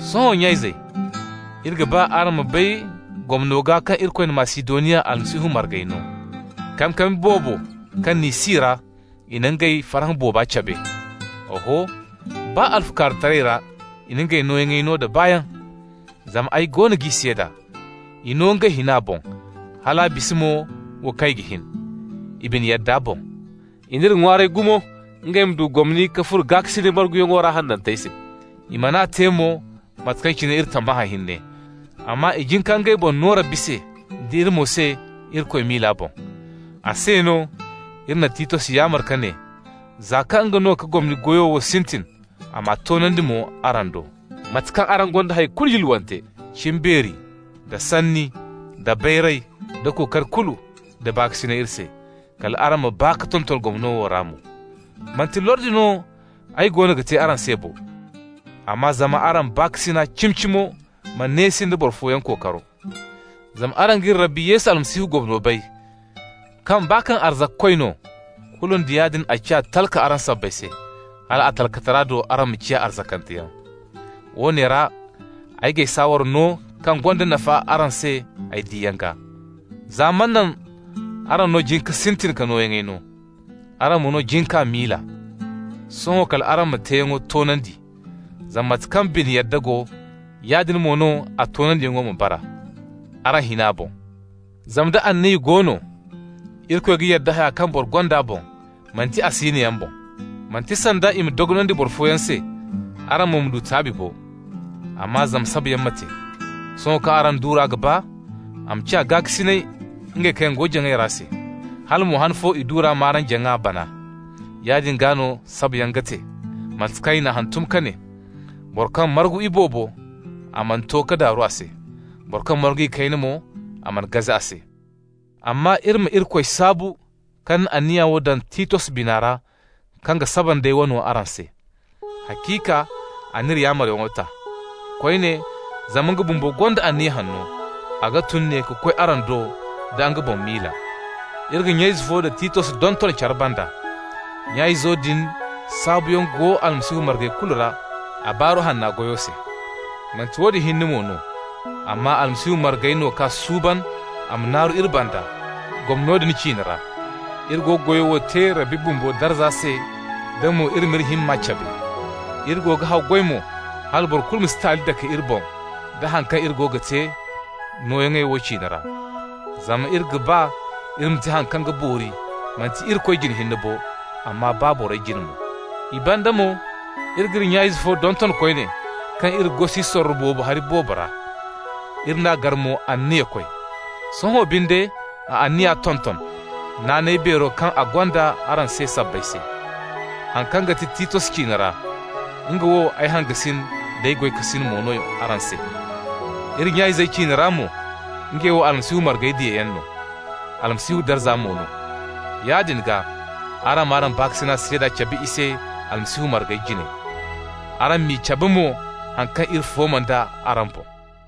Sohõ nya-izey, iri ga ba araŋ ma bay gomno gaa kaŋ Irikoy na Masidoniya Almasihu margey no. Kankami boobo kaŋ n'i si ra i na ngey farhã booba cabe. Oho, baa alfukaarutaray ra i na ngey nooyaŋey no da baayaŋ. Zama ay goono g'i seeda: i no ngey hina boŋ, hal a bisa mo wo kaŋ i ga hin, i bine yadda boŋ. I n'iri ŋwaaray gumo ngey ma du gomni ka furo gaakasinay marguyaŋo ra hanantey se. I man'a te mo mate kaŋ cine iri tammahã hinne, amma i jin ka ngey boŋ no Rabbi se, d'iri mo se Irikoy miila boŋ. A se no, iri na Titos yaamar ka ne, za kaŋ nga no ka gomni goyo sintin, a m'a toonandi mo araŋ do. Mate kaŋ araŋ gonda hay kulu yulwante -- cimbeeri, da sanni, da bayray, da kookari kulu, da baakasinay iri se -- kal araŋ ma baa ka tonton gomno wo ra mo. Manti lordi no ay goono ga te araŋ se bo, amma zama araŋ baakasinay cimi-cimo ma neesi nda boro fooyaŋ kookaro. Zama araŋ g'iri Rabbi Yesu Almasihu gomno bay, kaŋ baa kaŋ arzakakoy no, kulu nda yaadin a ciya talka araŋ sabbay se, hal a talkatara do araŋ ma ciya arzakanteyaŋ. Woone ra ay g'ay saawara no kaŋ gonda nafa araŋ se ay diyaŋ gaa. Za manaŋ araŋ no jin ka sintin ka nooyaŋey no. Araŋ mo no jin k'a miila. Sohõ kal araŋ m'a teeyaŋo toonandi, zama mate kaŋ bine yadda go, yaadin mo no a toonandiyaŋo ma bara, araŋ hina boŋ. Zama nda anniya go no, Irikoy ga yadda haya kaŋ boro gonda boŋ, manti a siinoyaŋ boŋ. Manti sanda i ma dogonandi boro fooyaŋ se, araŋ mo ma taabi bo, amma zama sabayaŋ ma te. Sohõ kaŋ araŋ duura ga baa, a ma ciya gaakasinay ngey kaŋ go jaŋay ra se, hala mo han fo i duura m'araŋ jaŋa bana. Yaadin gaa no sabayaŋ ga te. Mate kaŋ i n'a hantum ka ne: «Boro kaŋ margu iboobo, a mana to ka daaru a se, boro kaŋ margu ikayna mo, a mana gaze a se.» Amma iri ma Irikoy saabu kaŋ na anniya wo daŋ Titos bina ra kaŋ ga saba nd'ay wano araŋ se. Haciika a n'iri yaamaryaŋo ta. Koyne zama nga bumbo gonda anniya hanno, a ga tun ne ka koy araŋ do da nga boŋ miila. Iri ga nya-ize fo da Titos donton care banda. Nya-izo din saabuyaŋ go Almasihu margey kulu ra a Baaru Hanna goyo se. Manti woodin hinne mo no, amma Almasihu margey no k'a suuban a ma naaru iri banda gomno din ciine ra. Iri go ga goyo wo te Rabbi bumbo darza se da mo iri m'iri himma cabe se. Iri go ga haggoy mo hala boro kulu ma si taali dake iri boŋ da haŋ kaŋ iri go ga te nooyaŋo wo ciine ra. Zama iri ga ba iri ma te haŋ kaŋ ga boori, manti Irikoy jine hinne bo, amma baa borey jine mo. I banda mo iri g'iri nya-ize fo donton koyne kaŋ iri gosi sorro boobo hari boobo ra. Iri n'a gar mo anniyakoy. Sohõ binde a anniya tonton, naanay beero kaŋ a gonda araŋ se sabbay se. Haŋ kaŋ ga ti Titos ciine ra, nga wo ay hangasin d'ay goykasin mo no araŋ se. Iri nya-izey ciine ra mo, ngey wo Almasihu margey diyayaŋ no, Almasihu darza mo no. Yaadin gaa, araŋ m'araŋ baakasinay seeda cabe i se Almasihu margey jine. Araŋ m'i cabe mo haŋ kaŋ iri fooma nd'a araŋ boŋ.